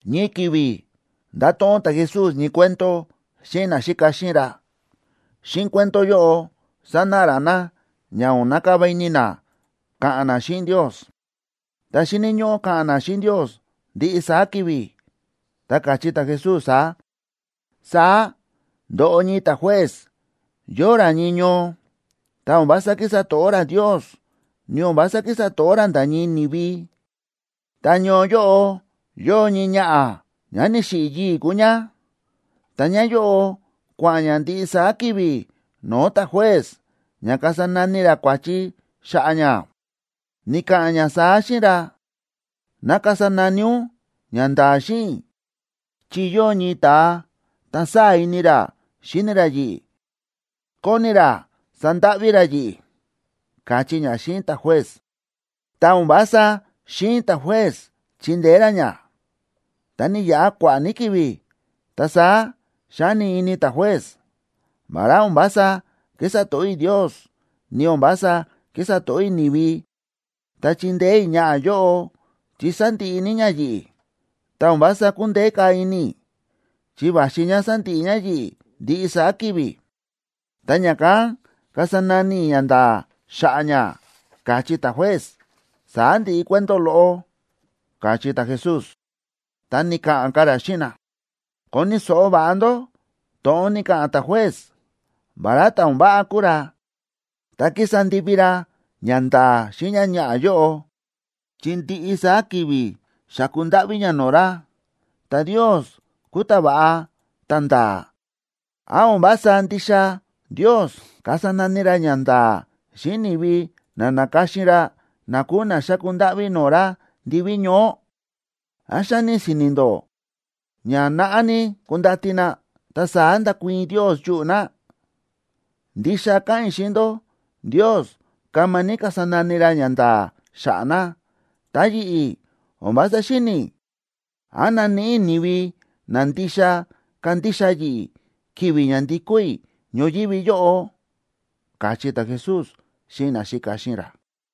Ñii ki̱vi̱ nda̱to̱ꞌon ta̱Jesús ñii cuento xíꞌin naxíka xíꞌin ra. Xíꞌin cuento yóꞌo sánáꞌa ra na ña o̱n nakava ini na ka̱ꞌa̱n na xíꞌin Ndios, ta xíni̱ ñóꞌó ka̱ꞌa̱n na xíꞌin Ndios ndiꞌi saá ki̱vi̱. Ta káchí ta̱Jesús saá: ―Saá ndo̱ꞌo ñii ta̱juez yóo ra ñii ñoo, ta o̱n vása kísa to̱ꞌó ra Ndios, ni o̱n vása kísa to̱ꞌó ra nda̱ ñii ni̱vi. Ta ñoo yóꞌo, yóo ñii ñaꞌa̱, ñá ni̱xiꞌi̱ yii̱ kúu ñá, ta ñáyóꞌo kua̱ꞌa̱n ñá ndiꞌi saá ki̱vi̱ no̱o̱ ta̱juez ña kasa nani ra kua̱chi xa̱ꞌa̱ ñá. Ni̱ka̱ꞌa̱n ñá saá xíꞌin ra: “Ná kasa nani ún ñanda̱a̱ xíꞌin i̱, chi yóo ñii ta̱a, ta sáa̱ ini ra xíni ra yi̱ꞌi̱, kóni ra sandáꞌví ra yi̱ꞌi̱”, káchí ñá xíꞌin ta̱juez. Ta o̱n vása xi̱in ta̱juez chindeé ra ñá. Ta ni̱yaꞌa kua̱ꞌa̱ ní ki̱vi̱, ta saá xa̱ni ini ta̱juez: “Vará o̱n vása kísa to̱ꞌó i̱ Ndios, ni o̱n vása kísa to̱ꞌó i̱ ni̱vi, ta chindeé i̱ ñaꞌa̱ yóꞌo, chi sándiꞌi ní ñá yi̱ꞌi̱, ta o̱n vása kúndeé ka̱ ini i̱, chi va̱xi ñá sandiꞌi ñá yi̱ꞌi̱ ndiꞌi saá ki̱vi̱. Ta ña̱kán kasa nani i̱ ñanda̱a̱ xa̱ꞌa̱ ñá”, káchí ta̱juez. Saá ndi̱ꞌi cuento loꞌo ―káchí ta̱Jesús. Ta ni̱ka̱ꞌa̱n ka̱ ra xíꞌin na: ―Koni̱ so̱ꞌo va̱ꞌa ndó to̱ꞌon ni̱ka̱ꞌa̱n ta̱juez. Vará ta̱ o̱n váꞌa kúu ra, ta ki̱sa ndivi ra ñanda̱a̱ xíꞌin ñáñaꞌa̱ yóꞌo, chi ndiꞌi saá ki̱vi̱ xáku ndáꞌví ñá no̱o̱ ra. Ta Ndios kúu ta̱va̱ꞌa ta̱nda̱a̱. ¿Án o̱n vása ndixa Ndios kasa nani ra ñanda̱a̱ xíꞌin ni̱vi na na̱ka̱xin ra, na kúu na xáku ndáꞌví no̱o̱ ra ndiví ñoó? ¿Án xáni si̱ni̱ ndó ña naꞌá ní kundati na, ta saá ndakuii̱n Ndios yuꞌu̱ na? Ndixa káꞌa̱n i̱ xíꞌin ndó. Ndios kama ní kasa nani ra ñanda̱a̱ xa̱ꞌa̱ na. Ta yi̱ꞌi̱, o̱n vása xíni̱ i̱, ¿án naníꞌi i̱ ni̱vi na ndixa kándixa yi̱ꞌi̱, ki̱vi̱ ña ndikó i̱ ñoyívi yóꞌo? ―káchí ta̱Jesús xíꞌin naxíka xíꞌin ra.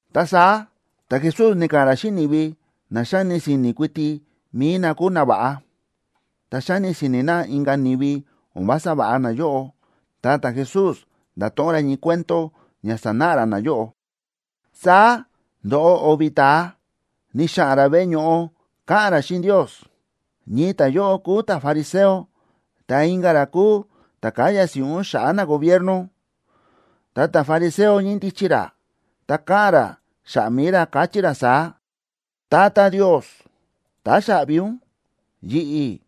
Ta saá ta̱Jesús ni̱ka̱ꞌa̱n ra xíꞌin ni̱vi na xáni si̱ni̱ kuiti mi̱i na kúu nava̱ꞌa, ta xáni si̱ni̱ na inka̱ ni̱vi, o̱n vása va̱ꞌa nayóꞌo. Ta ta̱Jesús nda̱to̱ꞌon ra ñii cuento ña sanáꞌa ra nayóꞌo: ―Saá ndo̱ꞌo o̱vi̱ ta̱a ni̱xa̱ꞌa̱n ra veꞌe ño̱ꞌo ka̱ꞌa̱n ra xíꞌin Ndios. Ñii ta̱yóꞌo kúu ta̱fariseo ta inka̱ ra kúu ta̱ káya si̱ꞌún xa̱ꞌa̱ nagobierno. Ta ta̱fariseo ñíndichi ra, ta káꞌa̱n ra xa̱ꞌa̱ mi̱i ra, káchí ra saá: “Tata Ndios, táxaꞌvi ún, yi̱ꞌi̱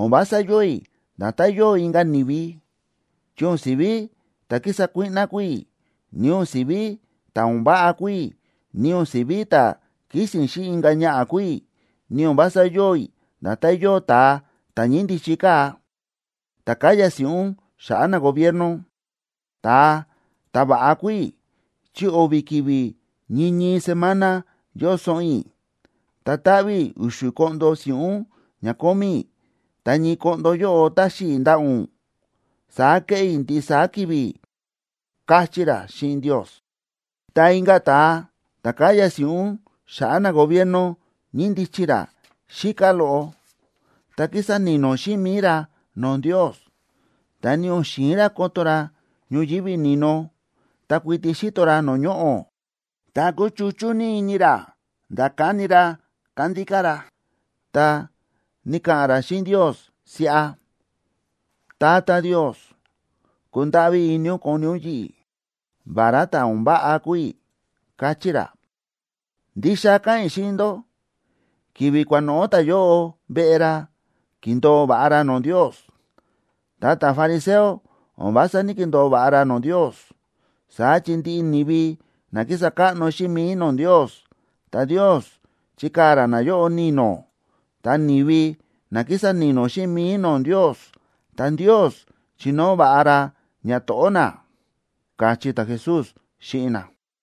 o̱n vása yóo i̱ nda̱tán yóo inka̱ ni̱vi, chi o̱n si̱ví ta̱ kísa kuíꞌná kúu i̱, ni o̱n si̱ví ta̱ o̱n váꞌa kúu i̱, ni o̱n si̱ví ta̱ kísi̱n xíꞌin inka̱ ñaꞌa̱ kúu i̱, ni o̱n vása yóo i̱ nda̱tán yóo ta̱a ta̱ ñíndichi kaa̱, ta̱ káya si̱ꞌún xa̱ꞌa̱ nagobierno. Ta̱a ta̱va̱ꞌa kúu i̱ chi o̱vi̱ ki̱vi̱ ñii ñii semana yóo soꞌon i̱. Ta táꞌví i̱ u̱xu̱ koꞌndo si̱ꞌún ña kómí i̱. Ta ñii koꞌndo yóꞌo táxi i̱ ndaꞌa̱ ún. Saá kéꞌé i̱ ndiꞌi saá ki̱vi̱”, káchí ra xíꞌin Ndios. Ta inka̱ ta̱a ta̱ káya si̱ꞌún xa̱ꞌa̱ nagobierno ñíndichi ra xíká loꞌo. Ta ki̱sa ni̱no̱ xíꞌin mi̱i ra no̱o̱ Ndios, ta ni o̱n xi̱in ra koto ra ñoyívi ni̱no, ta kuiti xíto ra no̱o̱ ñoꞌo̱. Ta kúchuchú ní ini ra nda̱ káni ra kándíká ra, ta ni̱ka̱ꞌa̱n ra xíꞌin Ndios siꞌa: “Tata Ndios, kundáꞌví ini ún koni ún yi̱ꞌi̱, vará ta̱ o̱n váꞌa kúu i̱”, káchí ra. Ndixa káꞌa̱n i̱ xíꞌin ndó, ki̱vi̱ kua̱noꞌo̱ ta̱yóꞌo veꞌe ra ki̱ndo̱o va̱ꞌa ra no̱o̱ Ndios. Ta ta̱fariseo, o̱n vása ní‑kindo̱o va̱ꞌa ra no̱o̱ Ndios. Saá chi ndiꞌi ni̱vi na kísa káꞌno xíꞌin mi̱i no̱o̱ Ndios, ta Ndios chikaa̱ ra nayóꞌo ni̱no̱. Ta ni̱vi na kísa ni̱no̱ xíꞌin mi̱i no̱o̱ Ndios, ta Ndios chinóo va̱ꞌa ra ñato̱ꞌó na ―káchí ta̱Jesús xíꞌin na.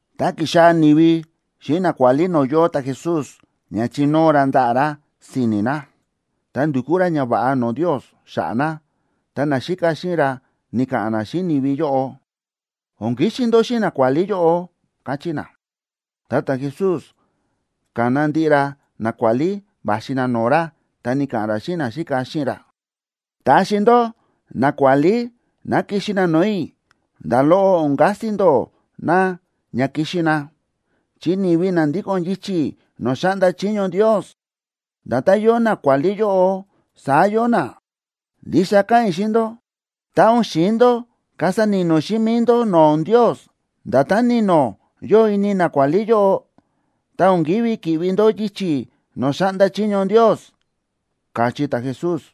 Ta ki̱xaa̱ ni̱vi xíꞌin nakuálí no̱o̱ yóo ta̱Jesús ña chinóo ra ndaꞌa̱ ra si̱ni̱ na, ta ndukú ra ñava̱ꞌa no̱o̱ Ndios xa̱ꞌa̱ na, ta naxíka xíꞌin ra ni̱ka̱ꞌa̱n na xíꞌin ni̱vi yóꞌo: ―O̱n kixi ndó xíꞌin nakuálí yóꞌo ―káchí na. Ta ta̱Jesús ka̱na ndiꞌi ra nakuálí va̱xi na no̱o̱ ra, ta ni̱ka̱ꞌa̱n ra xíꞌin naxíka xíꞌin ra: ―Taxi ndó nakuálí ná kixi na no̱o̱ i̱, nda̱ loꞌo o̱n kasi ndó na ña kixi na, chi ni̱vi na ndíko̱n yichi̱ no̱o̱ xáꞌnda chiño Ndios, nda̱tán yóo nakuálí yóꞌo, saá yóo na. Ndixa káꞌa̱n i̱ xíꞌin ndó, tá o̱n xi̱in ndó kasa ni̱no̱ xíꞌin mi̱i ndó no̱o̱ Ndios nda̱tán ni̱no̱ yóo ini nakuálí yóꞌo, ta o̱n kívi ki̱ꞌvi ndó yichi̱ no̱o̱ xáꞌnda chiño Ndios ―káchí ta̱Jesús.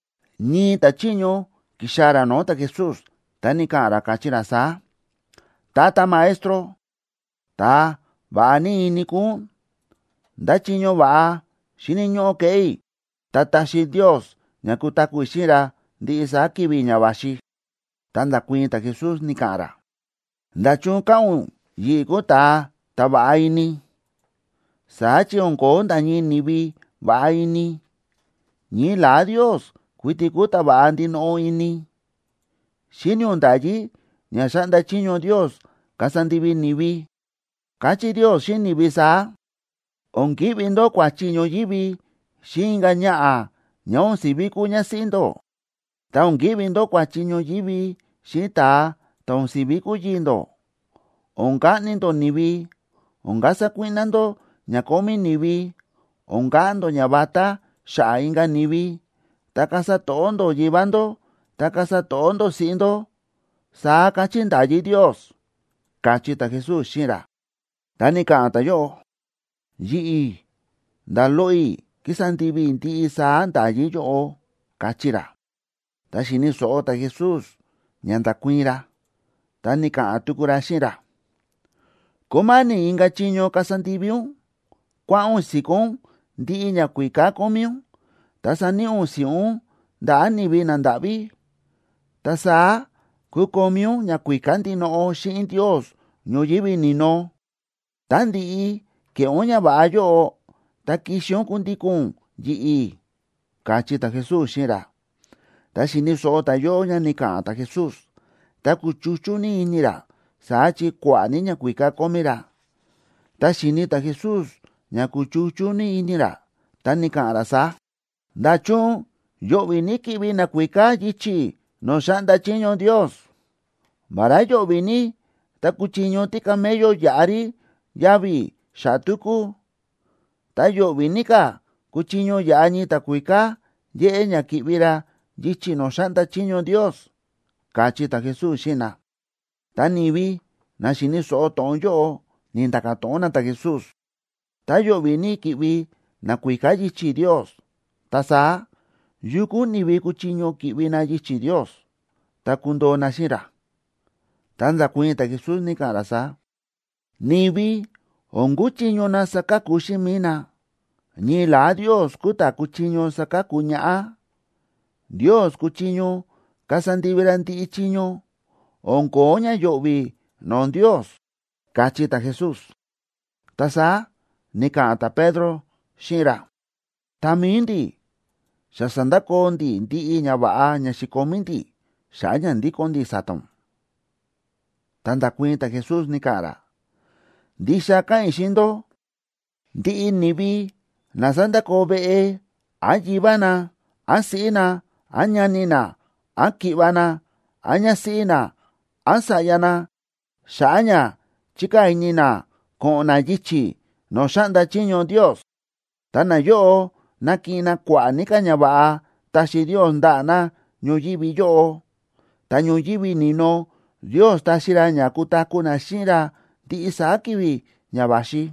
Ñii ta̱chiño ki̱xaa̱ ra no̱o̱ ta̱Jesús, ta ni̱ka̱ꞌa̱n ra, káchí ra saá: ―Tata Maestro, ta̱a va̱ꞌa ní ini kúu ún. ¿Ndá chiño va̱ꞌa xíni̱ ñóꞌó keꞌé i̱ ta taxi Ndios ña kutaku̱ i̱ xíꞌin ra ndiꞌi saá ki̱vi̱ ña va̱xi? Ta nda̱kuii̱n ta̱Jesús, ni̱ka̱ꞌa̱n ra: ―¿Nda̱chun káꞌa̱n ún yi̱ꞌi̱ kúu ta̱a ta̱ va̱ꞌa ini? Saá chi o̱n ko̱ó nda̱ ñii ni̱vi va̱ꞌa ini, ñii la̱á Ndios kuiti kúu ta̱ va̱ꞌa ndinoꞌo ini. Xíni̱ ún nda̱yí ña xa̱ꞌnda chiño Ndios kasa ndivi ni̱vi. Káchí Ndios xíꞌin ni̱vi saá: “O̱n ki̱ꞌvi ndó kua̱chi ñoyívi xíꞌin inka̱ ñaꞌa̱ ñá o̱n si̱ví kúu ñásíꞌí ndó, ta o̱n ki̱ꞌvi ndó kua̱chi ñoyívi xíꞌin ta̱a ta̱ o̱n si̱ví kúu yii̱ ndó, o̱n kaꞌni ndó ni̱vi, o̱n kasa kuíꞌná ndó ña kómí ni̱vi, o̱n ka̱ꞌa̱n ndó ñavatá xa̱ꞌa̱ inka̱ ni̱vi, ta kasa to̱ꞌó ndó yivá ndó, ta kasa to̱ꞌó ndó siꞌí ndó”, saá káchí nda̱yí Ndios ―káchí ta̱Jesús xíꞌin ra. Ta ni̱ka̱ꞌa̱n ta̱yóꞌo: ―Yi̱ꞌi̱ nda̱ loꞌo i̱ kísa ndivi i̱ ndiꞌi saá nda̱yí yóꞌo ―káchí ra. Tá xi̱ni̱ so̱ꞌo ta̱Jesús ña nda̱kuii̱n ra, ta ni̱ka̱ꞌa̱n tuku ra xíꞌin ra: ―Kúma̱ni̱ inka̱ chiño kasa ndivi ún. Kua̱ꞌa̱n ún si̱kó ún ndiꞌi ñakuíká kómí ún, ta saníꞌi ún si̱ꞌún ndaꞌa̱ ni̱vi nandáꞌví. Ta saá kukomí ún ñakuíká ndinoꞌo xíꞌin Ndios ñoyívi ni̱no. Tá ndi̱ꞌi ke̱ꞌé ún ñava̱ꞌa yóꞌo, ta kixi ún kundíko̱n ún yi̱ꞌi̱ ―káchí ta̱Jesús xíꞌin ra. Tá xi̱ni̱ so̱ꞌo ta̱yóꞌo ña ni̱ka̱ꞌa̱n ta̱Jesús, ta kúchuchú ní ini ra, saá chi kua̱ꞌa̱ ní ñakuíká kómí ra. Tá xi̱ni̱ ta̱Jesús ña kúchuchú ní ini ra, ta ni̱ka̱ꞌa̱n ra saá: ―¡Nda̱chun yo̱ꞌvi̱ ní ki̱ꞌvi nakuíká yichi̱ no̱o̱ xáꞌnda chiño Ndios! Vará yo̱ꞌvi̱ ní tá kuchiño tícamello yaꞌa rí yavi̱ xa̱ꞌa̱ túkú, ta yo̱ꞌvi̱ ní ka̱ kuchiño yaꞌa ñii ta̱kuíká yéꞌé ña ki̱ꞌvi ra yichi̱ no̱o̱ xáꞌnda chiño Ndios ―káchí ta̱Jesús xíꞌin na. Ta ni̱vi na xi̱ni̱ so̱ꞌo to̱ꞌon yóꞌo, ni̱nda̱ka̱ to̱ꞌon na ta̱Jesús: ―Tá yo̱ꞌvi̱ ní ki̱ꞌvi nakuíká yichi̱ Ndios, ta saá, ¿yu kúu ni̱vi kuchiño ki̱ꞌvi na yichi̱ Ndios, ta kundoo na xíꞌin ra? Ta nda̱kuii̱n ta̱Jesús, ni̱ka̱ꞌa̱n ra saá: ―Ni̱vi o̱n kúchiño na saka̱ku xíꞌin mi̱i na, ñii la̱á Ndios kúu ta̱ kúchiño saka̱ku ñaꞌá. Ndios kúchiño kasa ndivi ra ndiꞌi chiño. O̱n ko̱ó ña yo̱ꞌvi̱ no̱o̱ Ndios ―káchí ta̱Jesús. Ta saá ni̱ka̱ꞌa̱n ta̱Pedro xíꞌin ra: ―Ta mi̱i ndi̱, xa sa̱ndakoo ndi̱ ndiꞌi ñava̱ꞌa ña xi̱komí ndi̱, xa̱ꞌa̱ ña ndíko̱n ndi̱ sa̱ta̱ ún. Ta nda̱kuii̱n ta̱Jesús, ni̱ka̱ꞌa̱n ra: ―Ndixa káꞌa̱n i̱ xíꞌin ndó, ndiꞌi ni̱vi na sa̱ndakoo veꞌe, án yivá na, án siꞌí na, án ñani na, án ki̱ꞌva̱ na, án ñásíꞌí na, án sa̱ꞌya na, xa̱ꞌa̱ ña chíkaa̱ ini na ko̱ꞌo̱n na yichi̱ no̱o̱ xáꞌnda chiño Ndios, ta nayóꞌo nakiꞌin na kua̱ꞌa̱ ní ka̱ ñava̱ꞌa taxi Ndios ndaꞌa̱ na ñoyívi yóꞌo. Ta ñoyívi ni̱no Ndios taxi ra ña kutaku̱ na xíꞌin ra ndiꞌi saá ki̱vi̱ ña va̱xi.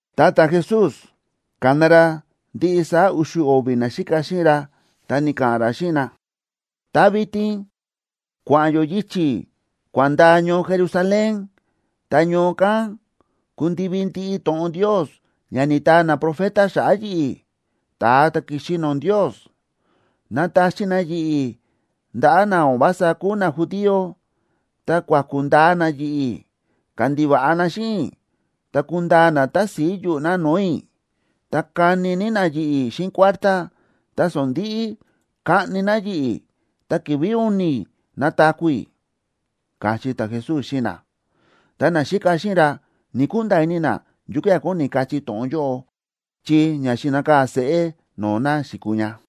Ta ta̱Jesús, ka̱na ra ndiꞌi saá u̱xu̱ o̱vi̱ naxíka xíꞌin ra, ta ni̱ka̱ꞌa̱n ra xíꞌin na: ―Ta vitin kua̱ꞌa̱n yó yichi̱ kua̱n ndaa ñoo Jerusalén, ta ñoo kán kundivi ndiꞌi to̱ꞌon Ndios ña ni̱taa naprofeta xa̱ꞌa̱ yi̱ꞌi̱, ta̱a ta̱ ki̱xi no̱o̱ Ndios. Nataxi na yi̱ꞌi̱ ndaꞌa̱ na o̱n vása kúu najudío, ta kuaku̱ ndaa na yi̱ꞌi̱, kandiva̱ꞌa na xíꞌin i̱, ta kundaa na tási̱i yuꞌu̱ na no̱o̱ i̱. Ta kani ní na yi̱ꞌi̱ xíꞌin kuártá, ta sondi̱ꞌi kaꞌni na yi̱ꞌi̱. Ta ki̱vi̱ u̱ni̱ nataku̱ i̱ ―káchí ta̱Jesús xíꞌin na. Ta naxíka xíꞌin ra ni̱‑kunda̱a̱ ini na yukía̱ kóni kachí to̱ꞌon yóꞌo, chi ña xi̱nakaa̱ seꞌé no̱o̱ na xi̱kuu ña.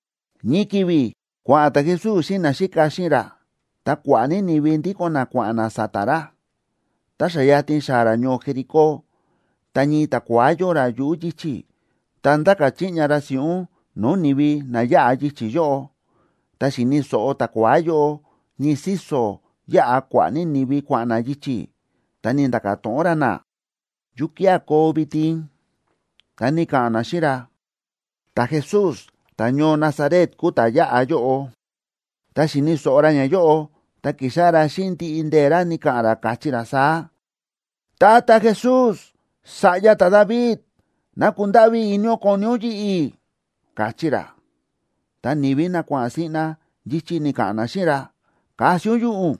Ñii ki̱vi̱ kua̱ꞌa̱n ta̱Jesús xíꞌin naxíka xíꞌin ra, ta kua̱ꞌa̱ ní ni̱vi ndíko̱n na kua̱ꞌa̱n na sa̱ta̱ ra. Ta xa yatin xáa̱ ra ñoo Jericó, ta ñii ta̱kua̱á yóo ra yuꞌu̱ yichi̱, ta ndáka̱ chiꞌña ra si̱ꞌún no̱o̱ ni̱vi na yáꞌa yichi̱ yóꞌo. Tá xi̱ni̱ so̱ꞌo ta̱kua̱á yóꞌo ñii síso̱ yáꞌa kua̱ꞌa̱ ní ni̱vi kua̱ꞌa̱n na yichi̱, ta ni̱nda̱ka̱ to̱ꞌon ra na: ―¿Yukía̱ koo vitin? Ta ni̱ka̱ꞌa̱n na xíꞌin ra: ―Ta̱Jesús ta̱ñoo Nazaret kúu ta̱ yáꞌa yóꞌo. Tá xi̱ni̱ so̱ꞌo ra ñayóꞌo, ta ki̱xáꞌá ra xíꞌin ndiꞌi ndee̱ ra ni̱ka̱ꞌa̱n ra, káchí ra saá: ―Tata Jesús, sa̱ꞌya ta̱David,a ¡ná kundáꞌví ini ún koni ún yi̱ꞌi̱! ―káchí ra. Ta ni̱vi na kua̱ꞌa̱n siꞌna yichi̱ ni̱ka̱ꞌa̱n na xíꞌin ra: ―¡Kasi ún yuꞌu̱ ún!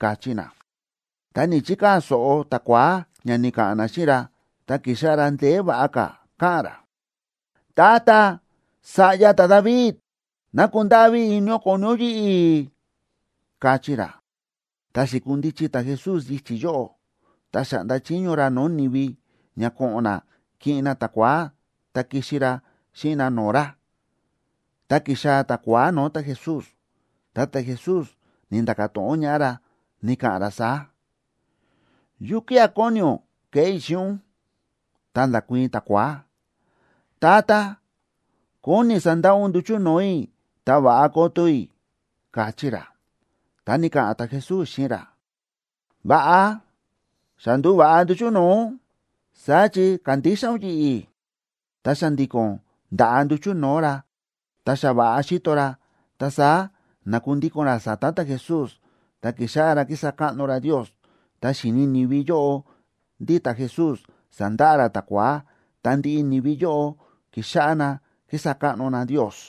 ―káchí na. Ta ni̱‑chikaa̱ so̱ꞌo ta̱kua̱á ña ni̱ka̱ꞌa̱n na xíꞌin ra, ta ki̱xáꞌá ra ndeé va̱ꞌa ka̱ káꞌa̱n ra: ―Tata, sa̱ꞌya ta̱David, ¡ná kundáꞌví ini ún koni ún yi̱ꞌi̱! ―káchí ra. Ta xi̱kundichi ta̱Jesús yichi̱ yóꞌo, ta xa̱ꞌnda chiño ra no̱o̱ ni̱vi ña ko̱ꞌo̱n na kiꞌin na ta̱kua̱á ta kixi ra xíꞌin na no̱o̱ ra. Tá ki̱xaa̱ ta̱kua̱á no̱o̱ ta̱Jesús, ta ta̱Jesús ni̱nda̱ka̱ to̱ꞌon ñaꞌá ra, ni̱ka̱ꞌa̱n ra saá: ―¿Yukía̱ kóni ún keꞌé i̱ xíꞌin ún? Ta nda̱kuii̱n ta̱kua̱á: ―Tata, kóni i̱ sandaꞌa ún nduchu̱ no̱o̱ i̱ ta va̱ꞌa koto i̱ ―káchí ra. Ta ni̱ka̱ꞌa̱n ta̱Jesús xíꞌin ra: ―Va̱ꞌa, xa ndu̱va̱ꞌa nduchu̱ no̱o̱ ún, saá chi kándixa ún yi̱ꞌi̱. Ta xa̱ndi̱ko̱n nda̱ꞌa nduchu̱ no̱o̱ ra, ta xa va̱ꞌa xíto ra, ta saá na̱kundíko̱n ra sa̱ta̱ ta̱Jesús, ta ki̱xáꞌá ra kísa káꞌno ra Ndios. Tá xi̱ni̱ ni̱vi yóꞌo ndí ta̱Jesús sa̱ndaꞌa ra ta̱kua̱á, ta ndiꞌi ni̱vi yóꞌo ki̱xáꞌá na kísa káꞌno na Ndios.